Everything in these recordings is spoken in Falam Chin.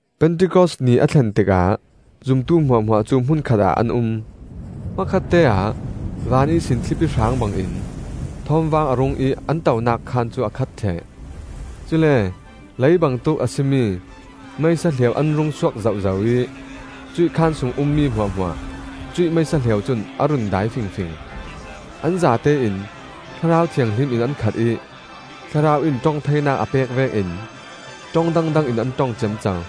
Pentikos ni a thlen tikah zumtu hmuahhmuah cu hmun khatah an um. Hmakhatte-ah van ihsin thlipi hrang bangin thawmvang a rung ih an tonak khaan cu a khat ṭheh. Cule lei bangtuk a si mi meisa hliau an rungsuak zohzo ih cuih khaan sung ummi hmuahhmuah cuih meisa hliau cun a run dai fingfing. An zatein Thlarau Thianghlim in an khat ih Thlarau in ṭong theinak a pek vekin ṭong dangdang in an ṭong ciamco.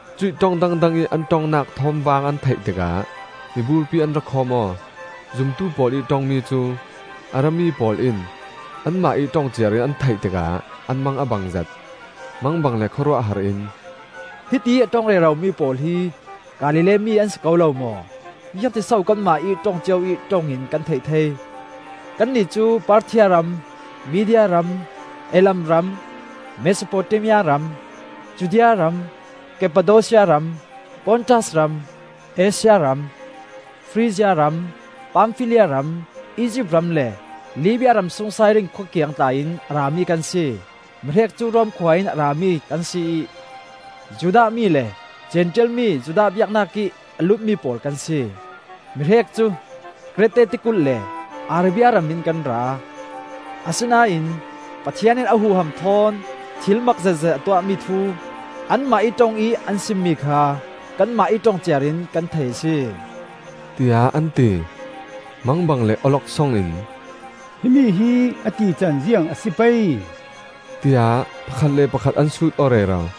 Cuih ṭong dangdang ih an ṭongnak thawmvang an theih tikah miburpi an ra khawm aw. Zumtu pawl ih ṭongmi cu a rami pawl in anmah ih ṭong ciarin an theih tikah an mang a bangzet. Mangbang le khawruahhar in, “Hitiih a ṭong reromi pawl hi Galilee mi an si ko lo maw? Ziangtin so kanmah ih ṭong cio ih ṭong in kan theih thei? Kannih cu Parthia ram, Media ram, Elam ram, Mesopotamia ram, Judea ram, Kappadosia ram, Pontas ram, Asia ram, Frizia ram, Pamfilia ram, Izipt ram le Libia ramsung Sairin khua kiang tla in a rami kan si. Mihrek cu Rom khua in a rami kan si ih, Judah mi le Zentail mi Judah biaknak ih a lutmi pawl kan si. Mihrek cu Krete tikulh le Arabia ram in kan ra. Asinain Pathian in a huham thawn thil mak zetzet a tuahmi thu anmah ih ṭong ih an simmi kha kanmah ih ṭong ciarin kan thei a si,” tiah an ti. Mangbang le awloksong in, “Himi hi a tican ziang a si pei?” tiah pakhat le pakhat an sut aw rero.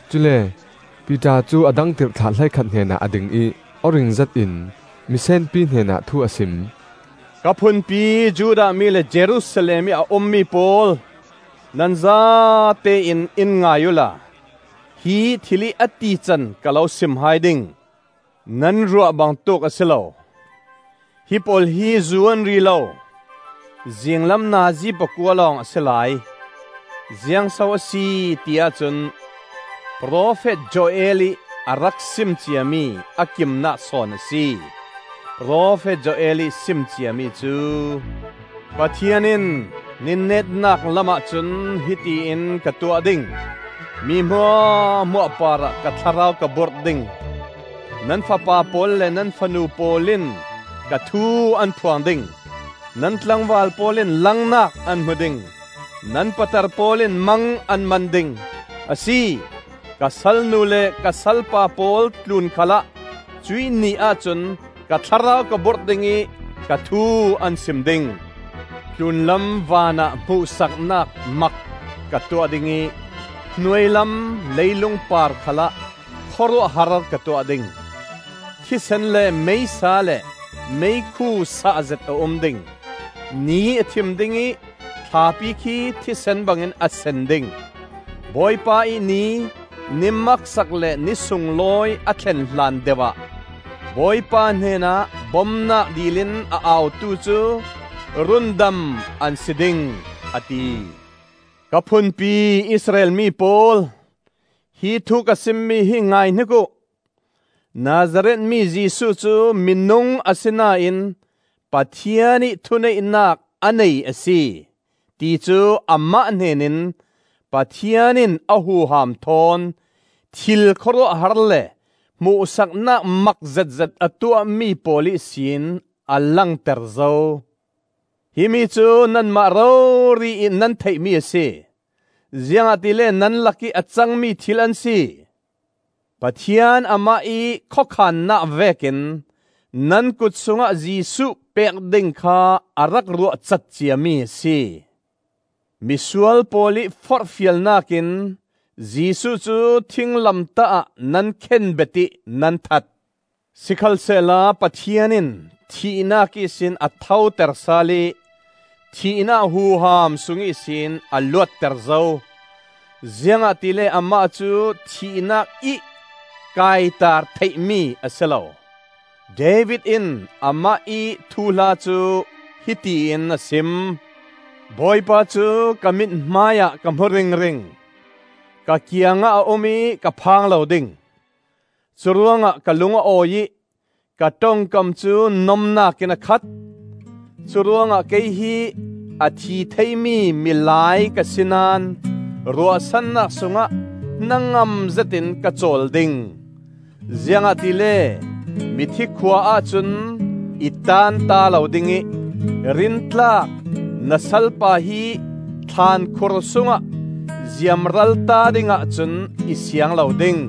Cule Piter cu a dang tirhthlah hleikhat hnenah a ding ih aw ring zetin misenpi hnenah thu a sim: “Ka phunpi Judah mi le Jerusalem ih a ummi pawl, nan zatein in ngai uhla, hi thil ih a tican ka lo sim hai ding. Nan ruah bangtuk a si lo; hipawl hi zu an ri lo; zinglam nazi pakua lawng a si lai. Ziang so a si ti ahcun profet Joel ih a rak sim ciami a kimnak sawn a si. Profet Joel ih sim ciami cu: ‘Pathian in, ni netnak lamah cun hiti in ka tuah ding; Mi hmuahhmuah parah ka Thlarau ka burh ding; Nan fapa pawl le nan fanu pawl in ka thu an phuang ding; Nan tlangval pawl in langnak an hmu ding; Nan patar pawl in mang an man ding; Asi, ka salnu le ka salpa pawl tlun khalah cuih ni ahcun Ka Thlarau ka burh ding ih, ka thu an sim ding. Tlunlam vanah hmuhsaknak mak ka tuah ding ih, Hnuailam leilung par khalah khawruahhar ka tuah ding. Thisen le meisa le meikhu sahzet a um ding. Ni a thim ding ih, thlapi khi thisen bangin a sen ding; Bawipa ih Ni - ni maksak le ni sunglawi a thlenhlan deuh ah, Bawipa hnenah bomnak dil in a autu cu rundam an si ding,’ a ti. “Ka phunpi Israel mi pawl, hi thu ka simmi hi ngaihnik uh! Nazareth mi Jesuh cu minung asinain Pathian ih thuneihnak a nei a si, ti cu amah hnenin Pathian in a huham thawn thil khawruahhar le hmuhsaknak mak zetzet a tuahmi pawl ihsin a langter zo. Himi cu nanmah rori ih nan theihmi a si, ziangahtile nan lakih a cangmi thil an si. Pathian amah ih khawkhannak vekin nan kut sungah Jesuh pek ding kha a rak ruahcat ciami a si. Misual pawl ih forhfialnakin Jesuh cu thinglamtah ah nan khenbet ih nan that. Sikhalsehla Pathian in thihnak ihsin a thoter sal ih thihnak huham sung ihsin a luatter zo, ziangahtile amah cu thihnak ih kaitar theihmi a si lo. David in amah ih thuhla cu hiti in a sim: ‘Bawipa cu ka mithmai ah ka hmu ringring; Ka kiangah a um ih ka phang lo ding. Curuangah ka lung a awi ih, ka ṭongkam cu nomnak in a khat. Curuangah kei hi a thi theimi milai ka si naón, ruahsannak sungah hnangam zetin ka cawl ding. Ziangahtile mithi khua-ah cun i taanta lo ding ih, rintlak na salpa hi thlankhur sungah ziamralta dingah cun i siang lo ding.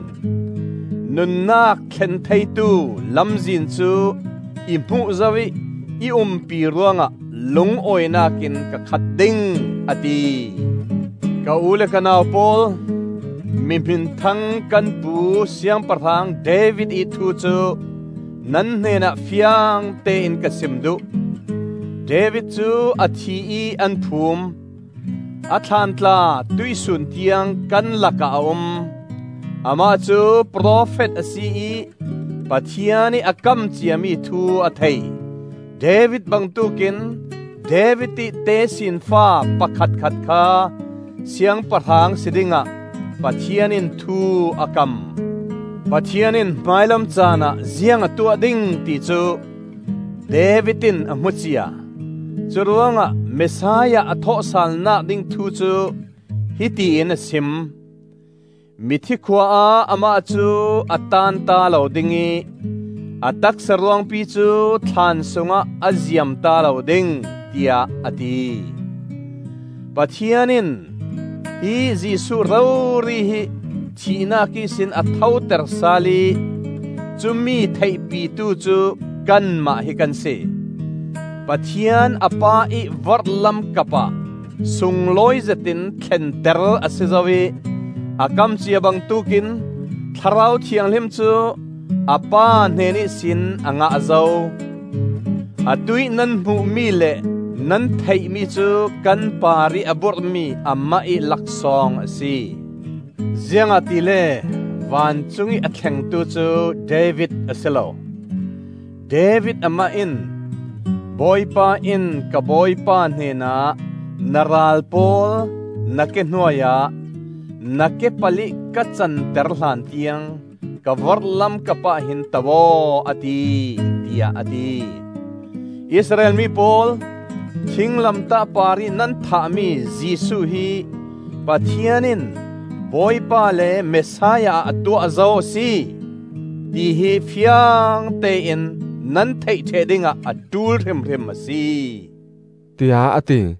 Nunnak thlen theitu lamzin cu i hmuh zo ih i umpi ruangah lungawinak in ka khat ding,’ a ti. “Ka u le ka nau pawl, mi hminthang kan pu Siangpahrang David ih thu cu nan hnenah fiangtein ka sim duh. David cu a thi ih an phum; a thlaan tla tuihsun tiang kan lakah a um. Amah cu profet a si ih Pathian ih a kam ciami thu a thei; David bangtuk in David ih tesinfa pakhatkhat kha siangpahrang si dingah Pathian in thu a kam. Pathian in hmailam caanah ziang a tuah ding ti cu David in a hmu cia; curuangah Messiah a thawhsalnak ding thu cu hiti in a sim: ‘Mithi khua ah amah cu a taanta lo ding ih, a taksa ruangpi cu thlaan sungah a ziamta lo ding,’ tiah a ti. Pathian in hi Jesuh rori hi thihnak ihsin a thoter sal ih cumi theihpitu cu kanmah hi kan si. Pathian a Pa ih vorhlam kapah sunglawi zetin thlenter a si zo ih a kam cia bangtuk in Thlarau Thianghlim cu a Pa hnen ihsin a ngah zo. Atuih nan hmuhmi le nan theihmi cu kan parih a burhmi amah ih laksawng a si. Ziangahtile vancungih a thlengtu cu David a si lo; David amah in: ‘Bawipa in ka Bawipa hnenah, na ral pawl na ke hnuai ah, Na kepal-ih ka canter hlantiang Ka vorhlam kapah hin to aw, a ti,’ tiah a ti. “Israel mi pawl, thinglamtah parih nan thahmi Jesuh hi Pathian in Bawipa le Messiah ah a tuah zo a si, tihi fiangtein nan theih ṭheh dingah a ṭul hrimhrim a si,” tiah a ti.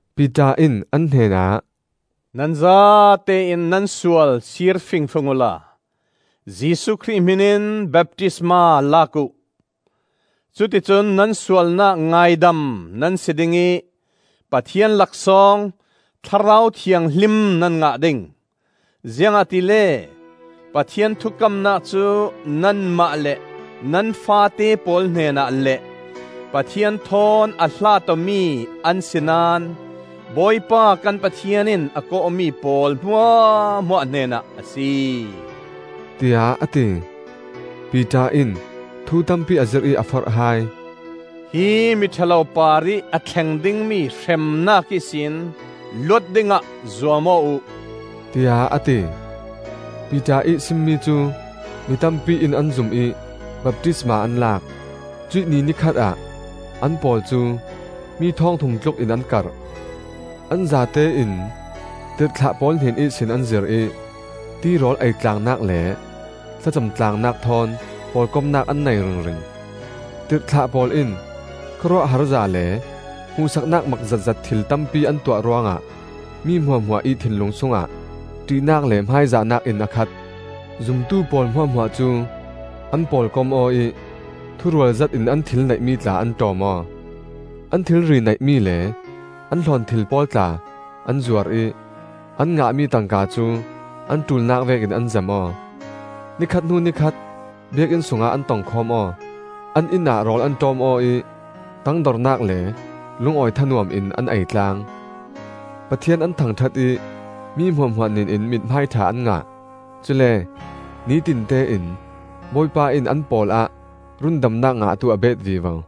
Piter in an hnenah, “Nan zatein nan sual sir fingfing uhla Jesuh Khrih hmin in baptisma lak uh; cuticun nan sualnak ngaidam nan si ding ih Pathian laksawng Thlarau Thianghlim nan ngah ding. Ziangahtile Pathian thukamnak cu nanmah le nan faate pawl hnenah le Pathian thawn a hlat awmi an si naón Bawipa kan Pathian in a kawhmi pawl hmuahhmuah hnenah a si,” tiah a ti. Piter in thu tampi a zirh ih a forh hai. “Hi miṭha lo parih a thleng dingmi hremnak ihsin luat dingah zuam aw uh,” tiah a ti. Piter ih simmi cu mi tampi in an zum ih baptisma an lak; cuih ni ni khatah an pawl cu mi thawngthum tlukin an karh. An zatein tirhthlah pawl hnen ihsin an zir ih, tirawl eitlangnak le thlacam tlangnak thawn pawlkomnak an nei ringring. Tirhthlah pawl in khawruahharza le hmuhsaknak mak zetzet thil tampi an tuah ruangah mi hmuahhmuah ih thinlung sungah ṭihnak le hmaizahnak in a khat. Zumtu pawl hmuahhmuah cu an pawlkom aw ih thurual zetin an thil neihmi tla an ṭawm aw. An thilri neihmi le an hlawnthil pawl tla an zuar ih an ngahmi tangka cu an ṭulnak vekin an zem aw. Ni khat hnu ni khat Biakinn sungah an tongkhawm aw; an inn ah rawl an ṭawm aw ih tangdornak le lungawi thanuam in an ei tlang. Pathian an thangṭhat ih mi hmuahhmuah hnenin mithmai ṭha an ngah. Cule nitinte in Bawipa in an pawlah rundamnak ngahtu a bet vivo.